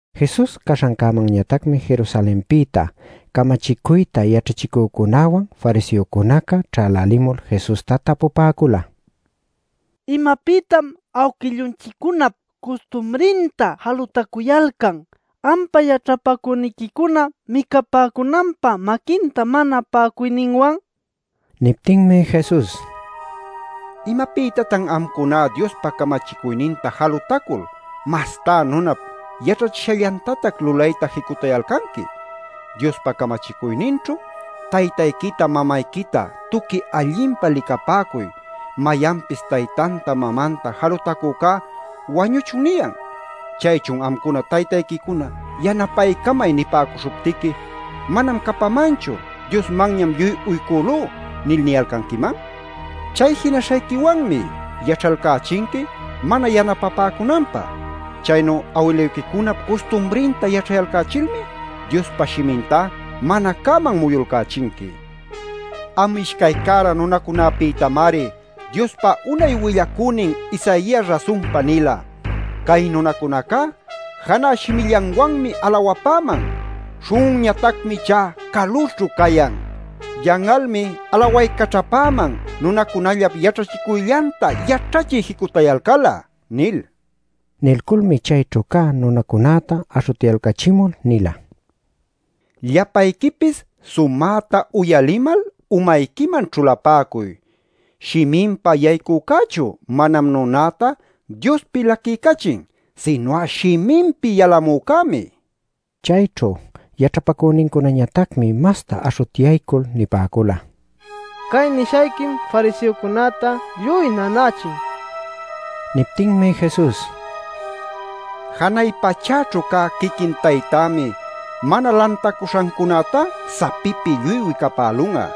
Jesus caśhancämanñatacmi Jerusalenpïta camachicuyta yaćhachicücunäwan fariseocunaca ćhälälimul Jesusta tapupäcula: “¿Imapïtatan awquillunchiccunap custumrinta jalutacuyalcan ampa yaćhapacüniquicuna micapäcunanpä maquinta mana pa'acuyninwan?” nil. Niptinmi Jesus: “¿Imapïtatan amcuná Diospa camachicuyninta jalutacul, mastá nunap yaćhachishallantatac lulayta jicutayalcanqui? Diospa camachicuyninćhu: ‘Taytayquita, mamayquita tuqui allinpa licapäcuy; mayanpis taytanta, mamanta jalutacücá wañuchun’ niyan. ¿Chaychun amcuna taytayquicuna ‘yanapaycamay’ nipäcuśhuptiqui ‘Manam capamanchu; Diosmanñam lluy uycülú’ nil niyalcanquiman? Chay jinaśhayquiwanmi yaćhayalcächinqui mana yanapapäcunanpä. Chaynu awiluyquicunap custumrinta yaćhayalcächilmi Diospa Shimintá mana cäman muyulcächinqui. Am ishcay cära nunacunapïtamari Diospa unay willacünin Isaias rasunpa nila: ‘Cay nunacunacá janä shimillanwanmi alawapäman. Śhun'unñatacmi ichá calućhu cayan. Yan'almi alawaycaćhapäman, nunacunallap yaćhachicuyllanta yaćhachiy jicutayalcal'a’ nil” nin. Nilculmi chayćhu cä nunacunäta aśhutyalcachimul nila: “Llapayquipis sumäta uyalimal, umayquiman ćhulapäcuy. Shiminpa yaycücächu manam nunäta Diospi laquiycachin. Sinu'a shiminpi yalamücämi” nin. Chayćhu yaćhapacünincunañatacmi masta aśhutyaycul nipäcula: “Cay nishayquim fariseocunäta lluy nanächin” nil. Niptinmi Jesus: “Janay pachäćhu cä quiquin Taytämi mana lantacuśhancunätá sapipi lluy wicapälun'a.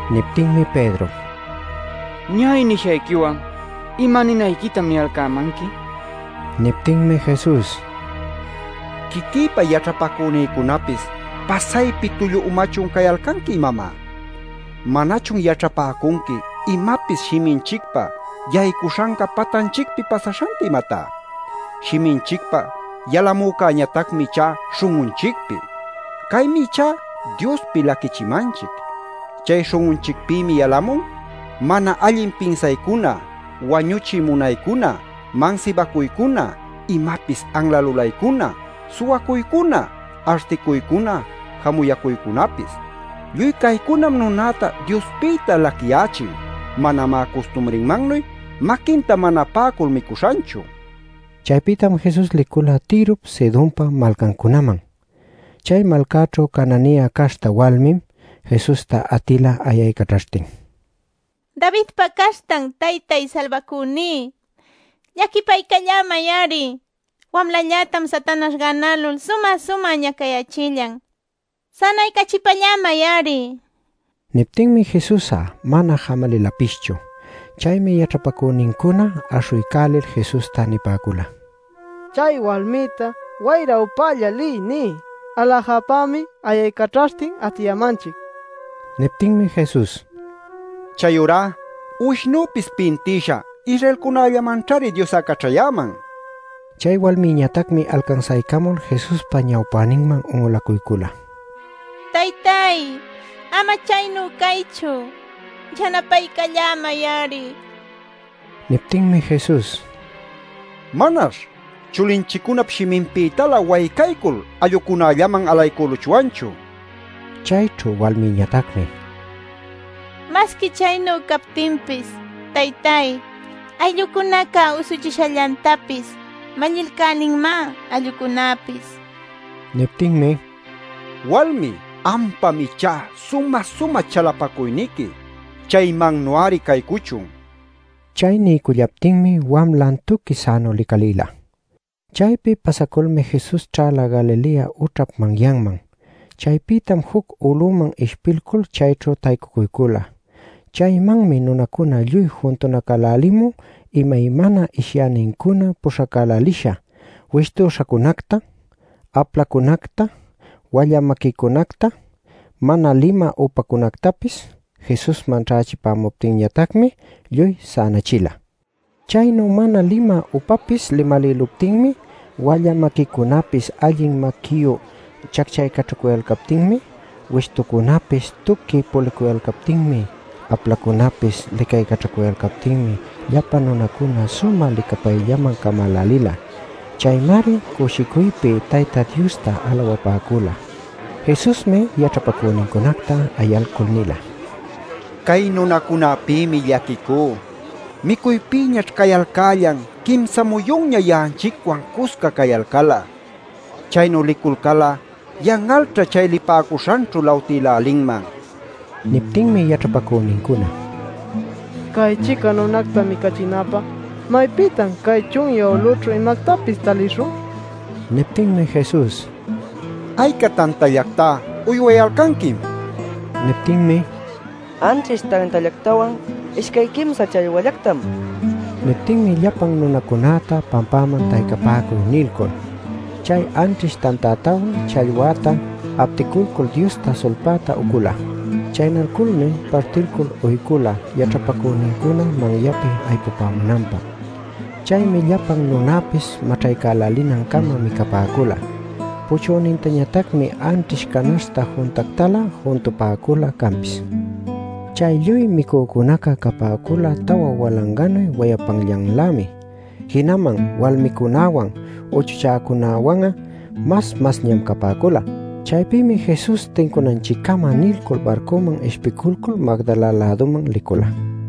Niptinmi Pedro: “Ña'ay nishayquiwan ¿ima ninayquitan niyalcämanqui?” nin. Niptinmi Jesus: “Quiquïpa yaćhapacünïcunapis ¿pasaypi tullu umachun cayalcanqui, imamá? ¿Manachun yaćhapäcunqui, imapis shiminchicpa yaycuśhanca patanchicpi pasaśhanta, imatá? Shiminchicpa yalamücäñatacmi ichá śhun'unchicpi. Caymi ichá Diospi laquichimanchic. Chay śhun'unchicpïmi yalamun mana allin pinsaycuna, wañuchiy munaycuna, mansibacuycuna, imapis anla lulaycuna, suwacuycuna, articuycuna, jamuyacuycunapis. Lluy caycunam nunäta Diospïta laquiyächin; manamá custumrinmannuy maquinta mana pa'acul micuśhanchu” nila. Chaypïtam Jesus licula Tirop, Sidonpa malcancunaman. Chay malcaćhu Cananea caśhta walmim Jesusta atila ayaycaćhaśhtin: “¡Davidpa caśhtan Taytay Salbacüní! ¡Llaquipaycallämay-ari! Wamlallätam Satanaśh gänälul sumä-sumä ñacayächillan. ¡Sänaycachipällämay-ari!” nishtin. Niptinmi Jesus'a mana jamalilapischu. Chaymi yaćhapacünincuna aśhuycälil Jesusta nipäcula: “Chay walmïta ‘wayra upälla liy’ niy; aläjapämi ayaycaćhaśhtin atiyämanchic” nil. Niptinmi Jesus: “Chayurá uwishnüpis pintïsha Israelcunallamanćhari Dios'a caćhayäman” nila. Chay walmiñatacmi alcansaycamul Jesuspa ñawpäninman un'ulacuycula: “¡Taytay ama chaynu caychu; yanapaycallämay-ari!” nila. Niptinmi Jesus: “Manash chulinchiccunap shiminpïtalä waycaycul allucunallaman alaycüluchwanchu” nin. Chayćhu walmiñatacmi: “Masqui chaynu captinpis, taytáy, ayllucunaca usuchishallantapis mallilcälinmá allucunäpis” nin. Niptinmi: “Walmi, ampam ichá sumä-sumä chalapacuyniqui. Chaymannu-ari caycuchun” nila. Chay niycullaptinmi wamlan tuqui sänu licalïla. Chaypi pasaculmi Jesus ćhäla Galilea ućhap manyanman. Chaypïtam juc uluman ishpilcul chayćhu taycucuycula. Chaymanmi nunacuna lluy juntunacälälimun imaymana ishyänincuna puśhacälälisha: wishtuśhacunacta, aplacunacta, walla maquicunacta, mana limä upacunactapis. Jesusman ćhächipäcuptinñatacmi lluy sänachila. Chaynu mana limä upapis limäluptinmi, walla maquicunapis allin maquiyu chacchaycaćhacuyalcaptinmi, wishtucunapis tuqui pulicuyalcaptinmi, aplacunapis licaycaćhacuyalcaptinmi llapa nunacuna sumä licapayllaman camälälila. Chaymari cushicuypi Tayta Diosta alawapäcula. Jesusmi yaćhapacünincunacta ayalcul nila: “Cay nunacunäpïmi llaquicú. Micuypïñaćh cayalcällan quimsa muyunña ya'anchicwan cusca cayalcal'a. Chaynu liculcal'a yan'alćha chay lipäcuśhanćhu lawtïlälinman” nil. Niptinmi yaćhapacünincuna: “Cay-chica nunacta micachinapä ¿maypïtan cay chunyä ulüćhu imactapis talishun?” nila. Niptinmi Jesus: “¿Ayca tantallactá uywayalcanquim?” nin. Niptinmi: “Anćhish tantallactawan, ishcay quimsa challwallactam” nipäcula. Niptinmi llapan nunacunäta pampäman “taycapäcuy” nilcul chay anćhish tantätawan challwäta apticulcul Diosta sulpayta ucula. Chaynalculmi partilcul uycula yaćhapacünincuna manyapi aypumunanpä. Chaymi llapan nunäpis maćhaycälinancama micapäcula. Puchünintañatacmi anćhish canaśhta juntactalä juntupäcula canpis. Chay lluy micücunaca capäcula tawa walanganuy wayapanllanlämi. Jinaman walmicunäwan uchuchäcunäwan'a mas masñam capäcula. Chaypïmi Jesus tincunanchiccama nilcul barcuman ishpiculcul Magdala-läduman licula.